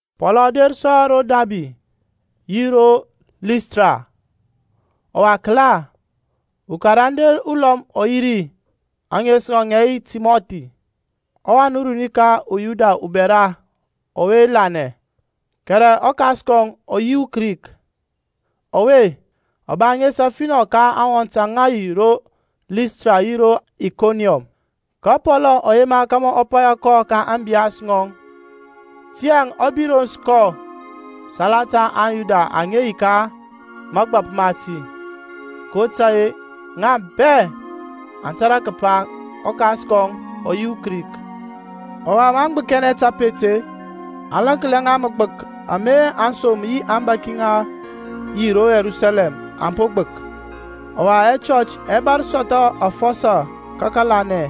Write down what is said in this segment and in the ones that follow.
Pɔlȧŋ ɔ der sɔ ro Dabi yi ro Listra. Ɔwa kəla, ukarande ulɔm ɔ yi ri, ȧŋes ŋɔŋ ŋə yi Timɔthi, ɔwan runi ka uYuda ubɛra ɔwe lanɛ, kɛrɛ ɔkas kɔŋ ɔ yi uKrik. Ɔwe, ɔ ba ŋes afinɔ ka aŋwɔnt aŋa yi ro Listra yi ro Ikoniɔm. Ka Pɔlȧŋ ɔ yema kȧmȧ ɔ paya kɔ ka ȧŋbiyas ŋɔŋ tiyȧŋ ɔ birons kɔ salata aŋYuda aŋa yi ka mȧgbȧp mati, kotȧy-e ŋa bɛ aŋ tȧrȧ kəpa ɔkas kɔŋ ɔ yi uKrik. Ɔwa maŋ gbəkinɛ tapet-e, aŋ laŋklia ŋa magbək ama aŋsom yi aŋbȧki aŋa yi ro Yerusalɛm aŋ po gbək. Ɔwa ɛchɔch ɛ bȧr sɔthɔ afɔsɔ ka kȧlanɛ,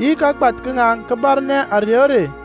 yi kagbath ka ŋaŋ kə bȧrnɛ ȧrey o rey.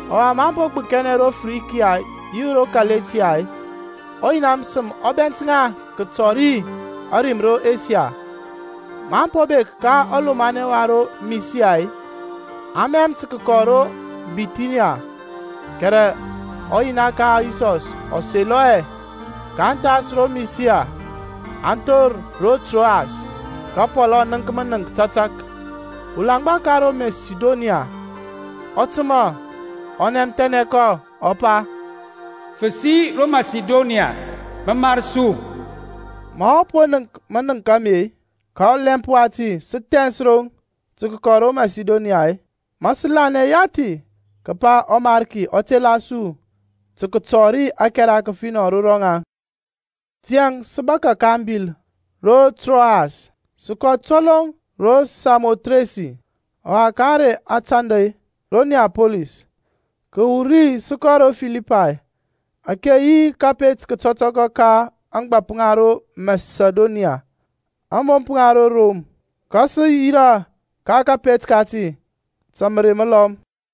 Ɔwa maŋ po gbəkinɛ ro Frikia yi ro Kaletia-e, ɔYina məsəm ɔ bɛnt ŋa kətɔri ȧrim ro Asia. Maŋ po bek ka ɔlomanɛ wa ro Misia-e, aŋ mɛm tə kəkɔ ro Bithiniya, kɛrɛ ɔYina ka Yisɔs ɔ selɔ hɛ. kaŋ thas ro Misia, aŋ thor ro Troas. Ka Pɔlȧŋ ɔ nənk mənəŋk tȧtȧk; ulaŋgba ka ro Masidoniya ɔ təmȧ, ɔ nɛmthɛnɛ kɔ, ɔ pa, Fəsi ro Masidoniya, mə mar su. Ma ɔ po nənk manəŋk ame-e, ka ɔlɛmp wati sə thɛns roŋ tə kəkɔ ro Masidonya-e, ma sə lanɛ yathi kəpa ɔMarki ɔ tela su tə kətɔri ȧkɛra kəfinɔ ro rɔŋaŋ. Tiyȧŋ sə bȧkȧ ka abil ro Troas, sə kɔ toloŋ ro Samothresi, ɔwa ka ȧŋrey ȧtandȧ, ro Niapolis. Kəwur ri sə kɔ ro Filipay, ȧke yi kȧpet kətɔtɔkɔ ka ȧŋgbȧp ŋa ro Masidoniya, ȧŋbomp ŋa ro Rom; ka sə yirȧ ka kȧpet kati ta mərey məlɔm.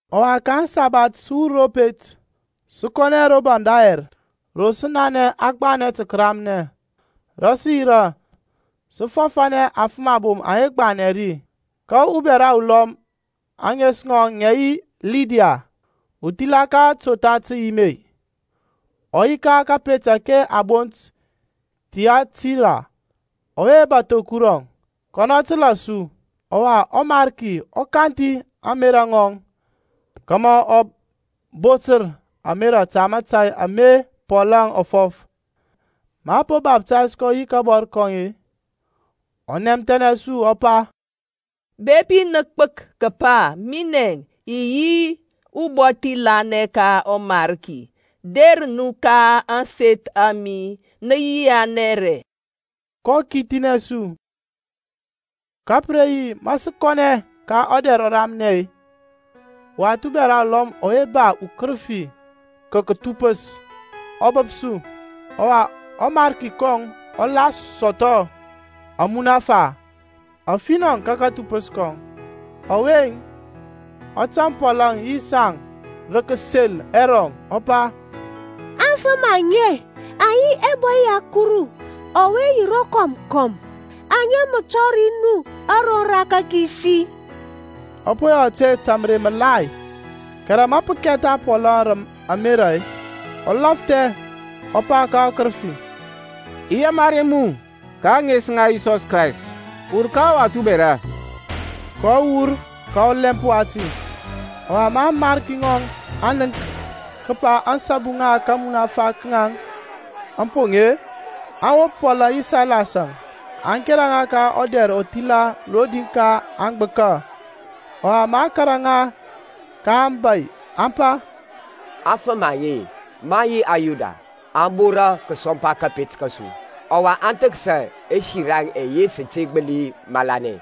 Ɔwa ka aŋsabath sə wur ro pet, sə kɔnɛ ro baŋ dayɛr ro sə nanɛ a gbanɛ tə kəramnɛ; rə sə yirȧ, sə fɔfȧnɛ aŋfəm abom aŋa gbanɛ ri. Ka ubɛra ulɔm, ȧŋes ŋɔŋ ŋȧ yi Lidya, uthila totha təyim-e, ɔ yi ka kȧpet ȧke a bont Thiatira, ɔwe bȧtho Kurɔŋ; kɔnɔ təlȧ su. Ɔwa ɔMarki ɔ kanthi ȧŋmerȧ ŋɔŋ kȧmȧ ɔ botər ȧmerȧ ta mȧtȧy ama Pɔlȧŋ ɔ fɔf. Ma a po baftays kɔ yi kabɔr kɔŋ-e, ɔ nɛmthɛnɛ su ɔ pa, Bepi nə gbək kəpa minɛ i yi ubɔthi lanɛ ka ɔMariki-e, der nu ka ȧŋseth a mi, nə yianɛ ri. Kɔ kithinɛ su. Ka pə re yi ma sə kɔnɛ ka ɔdɛr ɔramnɛ-e, uwath bɛra ulɔm ɔwe ba ukərəfi ka kȧthupəs ɔ bəp su, ɔwa ɔmarki kɔŋ ɔ la sɔthɔ amunafa afinɔ ka kathupəs kɔŋ. Ɔwe-əŋ, ɔ tȧŋ Pɔlȧŋ yi saŋ rə kəsel ɛrɔŋ kəpa, Afəm aŋe aŋ yi ɛbɔy ya ɔKuru ɔwe yi rokɔm kɔm, aŋa mə tɔri nu aroŋ ra kȧkisi. Ɔ po yɔ ȧte ta mərey məgbȧthi gbȧthi, kɛrɛ ma pə kɛtha Pɔl rə amera-e, ɔ lafthɛ ɔ pa ka ɔkərəfi, I yamari mu ka ȧŋes ŋa Yisɔs Krayst, wur ka ɔwath ubɛra. Kɔ wur ka ɔlɛmp wati. Ɔwa ma amarki ŋɔŋ aŋ nənk kəpa ȧŋsabu ŋa kamunafa ka ŋaŋ aŋ poŋ-e, aŋ wop Pɔlȧŋ yi Sailas-əŋ, aŋ kera ŋa ka ɔdɛr ɔthila rodi ka aŋgbəka. Ɔwa maŋ kȧrȧ ŋa ka aŋbȧy aŋ pa, Aŋfəm aŋe, maŋ yi aYuda, aŋ bora kəsɔmpa kȧpet kȧsu, ɔwa aŋ thəksa ɛsiraŋ ɛyɛ sə te gbəli malanɛ,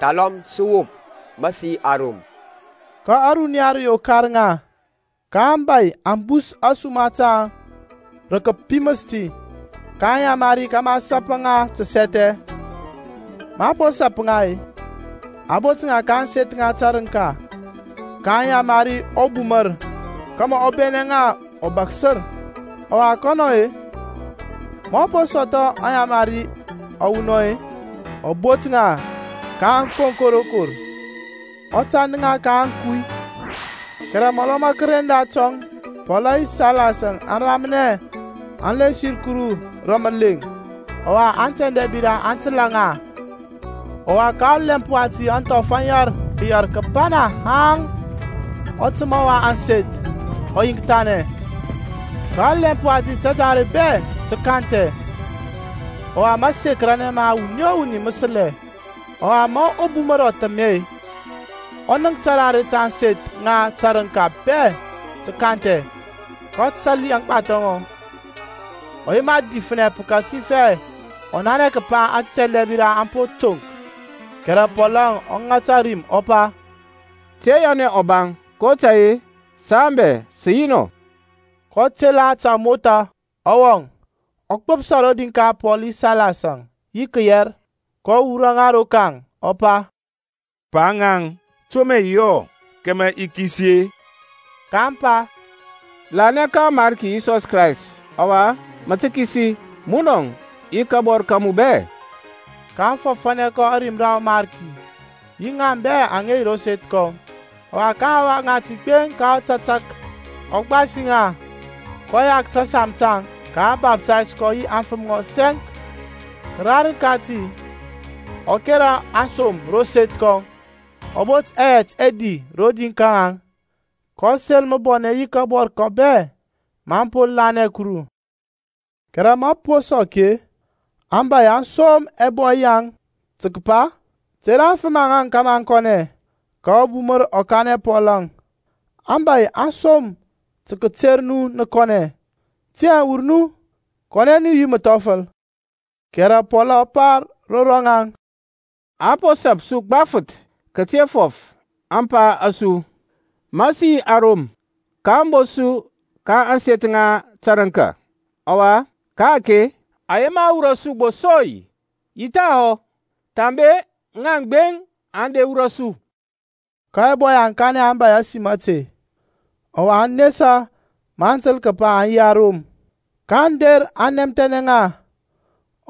thalɔm wop, ma sə yi aRom. Ka ȧruniya rə yokar ŋa, ka aŋbȧy aŋ bus ȧsuma taŋ rə kəpiməs ti, kaŋ yamari kȧmȧ a sapa ŋa təsɛthɛ. Maŋ po sap ŋa-e, aŋ bot ŋa ka ȧŋseth ŋa tȧrəŋka, kaŋ yamari ɔbumər kȧmȧ ɔ bɛnɛ ŋa ɔbaksər. Ɔwa kɔnɔ-e, ma ɔ po sɔthɔ ayamari awunɔŋ-e, ɔ bot ŋa ka ȧŋkonko rokor, ɔ tand ŋa ka ȧŋkuy. Kɛrɛ mɔlɔ ma kəren datɔŋ Pɔl yi Sailas aŋ ramnɛ aŋ lensir Kuru rə məleŋ, ɔwa antɛndɛbira aŋ təlȧ ŋa. Ɔwa ka ɔlɛmp wati ȧŋthɔf aŋ yɛr kəyɛr kəbana haŋ ɔtəma wa ȧŋseth ɔ yiŋkthanɛ. Ka ɔlɛmp wati tadare bɛ tə kanthɛ, ɔwa məsekəranɛ ma wuni o wuni mə səlɛ. Ɔwa ma ɔbumər ɔ thəmɛ-e, ɔ nənk tarare ta ȧŋseth ŋa tȧrəŋka bɛ tə kanthɛ, kɔ tali aŋgbathɔ ŋɔŋ, ɔ yema difnɛ pəkasifɛ ɔ nanɛ kəpa atɛndɛbira aŋ po toŋk. Kɛrɛ Pɔlȧŋ ɔ ŋata rim ɔ pa, Te yɔnɛ ɔbaŋ, kotȧy-e saŋ bɛ sə yi nɔ. kɔ tela ta amotha, ɔ wɔŋ, ɔ gbəpsa rodi ka Pɔl yi Sailas-əŋ yi kəyɛr, kɔ wurɔ ŋa rokaŋ, ɔ pa, Pa-ŋaŋ, to mə i yɔ kȧmȧ i kisi-e? kaŋ pa, Lanɛ ka ɔMarki Yisɔs Krayst, ɔwa mə tə kisi, munɔŋ yi kabɔr ka mu bɛ. kaŋ fɔfȧnɛ kɔ ȧrim ra ɔMarki, yi ŋaŋ bɛ aŋa yi ro seth kɔŋ. Ɔwa ka aŋhawa ŋati gbeŋ ka tȧtȧk, ɔ gbasi ŋa, kɔ yak tȧsam taŋ, ka a baftays kɔ yi aŋfəm ŋɔŋ sɛŋk. Kərarəŋ kati ɔ kȧrȧ aŋsom ro seth kɔŋ, ɔ bot ɛyɛt ɛdi rodi ka ŋaŋ, kɔ sel məbɔnɛ yi kabɔr kɔŋ bɛ, ma ɔ po lanɛ Kuru. Kɛrɛ ma pə po sɔk-e, aŋbȧy aŋ som ɛbɔy yaŋ tə kəpa, Ter aŋfəm aŋaŋ kȧmȧ aŋ kɔnɛ. Ka ɔbumər ɔ kanɛ Pɔlȧŋ, aŋbȧy aŋ som tə kəter nu nə kɔnɛ, tiyȧŋ wur nu, kɔnɛ nu yi məthɔfəl. Kɛrɛ Pɔl ɔ pa ro rɔŋaŋ, Aŋ po sap su gbafəth kəte fɔf ȧŋpa a su, ma sə yi aRom, kaŋ bot su ka ȧŋseth ŋa tərəŋka. Ɔwa ka-ake aŋ yema wurɔ su gbo sɔi-i? Yi thahɔ. Thambe ŋaŋ gbeŋ aŋ der wurɔ su. Ka ɛbɔy aŋ kanɛ aŋbȧy ȧsim ȧte, ɔwa aŋ nesa maŋ təl kəpa aŋ yi aRom. kaŋ der aŋ nɛmthɛnɛ ŋa,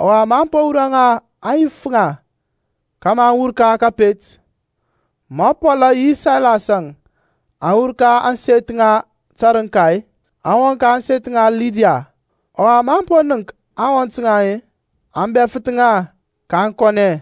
ɔwa maŋ po wurɔ ŋa aŋ yif ŋa kȧmȧ aŋ wur ka kȧpet. Ma Pɔlȧŋ yi Sailas-əŋ aŋ wur ka ȧŋseth ŋa tərəŋka-e, aŋ wɔŋ ka ȧŋseth ŋa Lidia. Ɔwa maŋ po nənk aŋwɔnt-e, aŋ bɛfəth ŋa, kaŋ kɔnɛ.